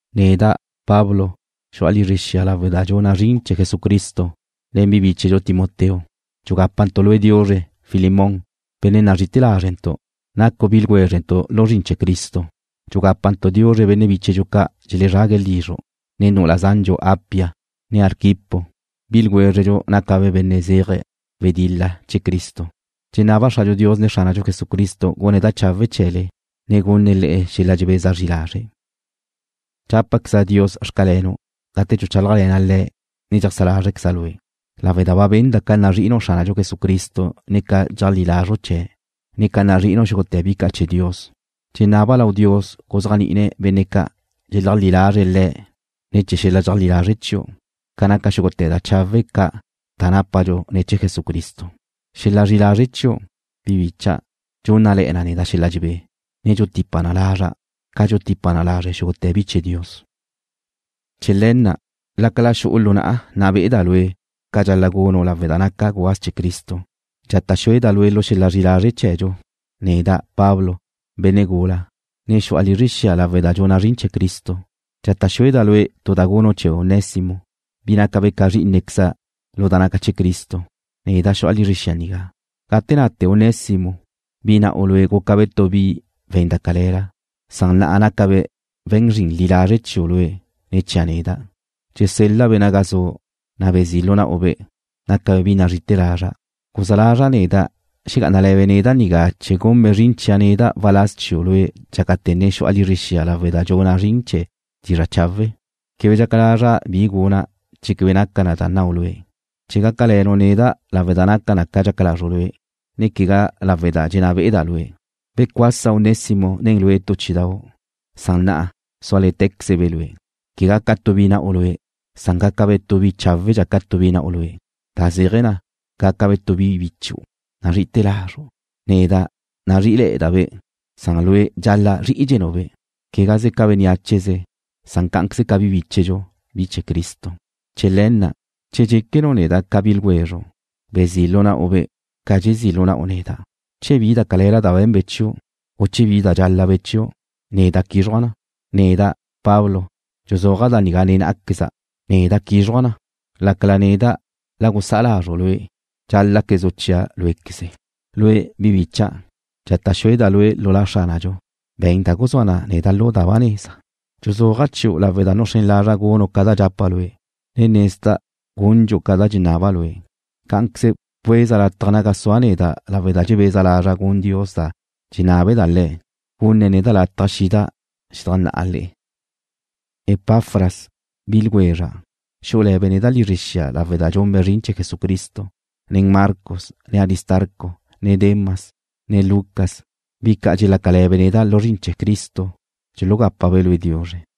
Neda', Pablo, xu'a lizre xia lawe' da dxuna' zrin chee̱ Jesucristo, nen bi bíchedxu Timoteo. Dxugápantu' lue' diuzre, Filemón, benne' nazrí'ite̱ lázrentu'. Nacu' bi ljwézrentu' lu zrin chee̱ Cristo. Dxugapa' diuzre benne' bíchedxu ca' dxelezrague̱' lizru', ne nu'ula zandxu Apia, ne Arquipo, bi ljwézredxu nácabe' benne' zeje̱' wedil-la chee̱ Cristo. Dxenaba' Xradxu Dios ne Xránadxu Jesucristo gune̱' da chawe' chee̱le, ne gunne̱' le'e xel-la' dxebeza zri lazre'. Dxápequeza' Dios xcalenu' gate dxuchálajle̱na' Le̱' ne dxeajsá lázrqueza' lue', lawe' da ba benda' ca nazri'inu' Xránadxu Jesucristo ne ca dxeajlí lazru' Le̱', ne ca nazri'inu' xúgute̱ bi ca' chee̱ Dios. Dxenaba' lau Dios guzéajni'ine̱' benne' ca' dxeleajlí lazre̱' Le̱' ne̱ chee̱ xel-la' dxeajlí lazre' chiu', ca naca xúgute̱ da chawe' ca' da nápadxu ne̱ chee̱ Jesucristo. Xel-la' zri'i lazre' chiu', bi bicha', dxúnnale̱'e̱ na neda' xel-la' dxebé, ne dxutipa na lazra', ca dxutipa na lazre' xúgute̱ bi chee̱ Dios. Chee̱ le̱ na', lácala xu'u lu na'a nna be'eda' lue' ca dxal-la' gunu' lawe' da naca' gubáz chee̱ Cristo, dxata' xúeda' lue' lu xel-la' zri'i lazre' chee̱dxu, neda', Pablo, benne' gula, ne xu'a lizre xia lawe' da dxuna' zrin chee̱ Cristo. Dxata' xúeda' lue' tu da gunu' chee̱ Onésimo, bi nácabe' ca zrí'inequeza' lu da naca chee̱ Cristo, neda', xu'a lizre xia nigá. Gate nate Onésimo, bi na'u lue' gúcabe' tu bi we̱n da cale̱la, san na'a nácabe' we̱n zrin li lazre' chiu' lue', ne chia' neda'. Dxesel-la'-be' naga zu'. Bezí' lu na'u-be', nácabe' bi nazrí'ite̱ lazra'. Guzá lazra' neda' xegá'anale̱be' neda' nigá chee̱ gunbe' zrin chia' neda' waláz chiu' lue' dxácate̱ ne xu'a lizre xia lawe' da dxuna' zrin chee̱ dizra' chawe'. Quebe dxaca lazra' bi guna' che quebe naca na da nnau' lue', chee̱ gácale̱nu' neda' lawe' da naca na ca dxaca lazru' lue', ne quegá lawe' da dxenná be'eda' lue'. Becuasa Onésimo nen lue' tu chí'idau', san na'a súale̱tequezebe' lue', quegá ca tu bi na'u lue', san gácabe' tu bi cháwedxa ca tu bi na'u lue', da zéaje̱ na, gácabe' tu bi bichu' nazri'ite̱ lazru'. Neda' nazrí'ile̱'e̱da'-be', san lue' dxal-la' zrí'idxenu'-be', quegaze ca bénneacheze, san cá'anqueze ca bi bíchedxu, bi chee̱ Cristo. Chee̱ le̱ na', che dxéquenu' neda' ca bi ljwezru', bezí' lu na'u-be' ca dxezí' lu na'u neda'. Che bi da cale̱la ba be̱nbe' chiu', u che bi dxál-labe' chiu', neda' quízruja' na. Neda', Pablo, dxuzúaja' da nigá nen ná'aqueza': Neda' quízruja' na, lácala neda' la gusá'a lazru' lue' dxál-laquezu' chia' cuínquezu'. Lue', bi bicha', dxata' xúeda' lue' lu La Xránadxu, be̱n da guzúa na neda' lu da ba neza. Dxuzúaja' chiu' lawe' da nuxrén lazra' gunu' ca da dxapa' lue', ne nezda' gundxu' ca da dxenaba' lue'. Cá'anqueze bcueza latja naga sua' neda' lawe' da dxebeza lazra' gun Dios da dxenábale Le̱', gunne̱' neda' lataj xida' xedajnná'a le'e. Epafras, bi ljwezra', xú'ule̱be' neda' lizre xia lawe' da dxunbe' zrin chee̱ Jesucristo, ne Marcos, ne Aristarco, ne Demas, ne Lucas, bi ca' dxelácale̱be' neda' lu zrin chee̱ Cristo dxulugápabe' lue' diuzre.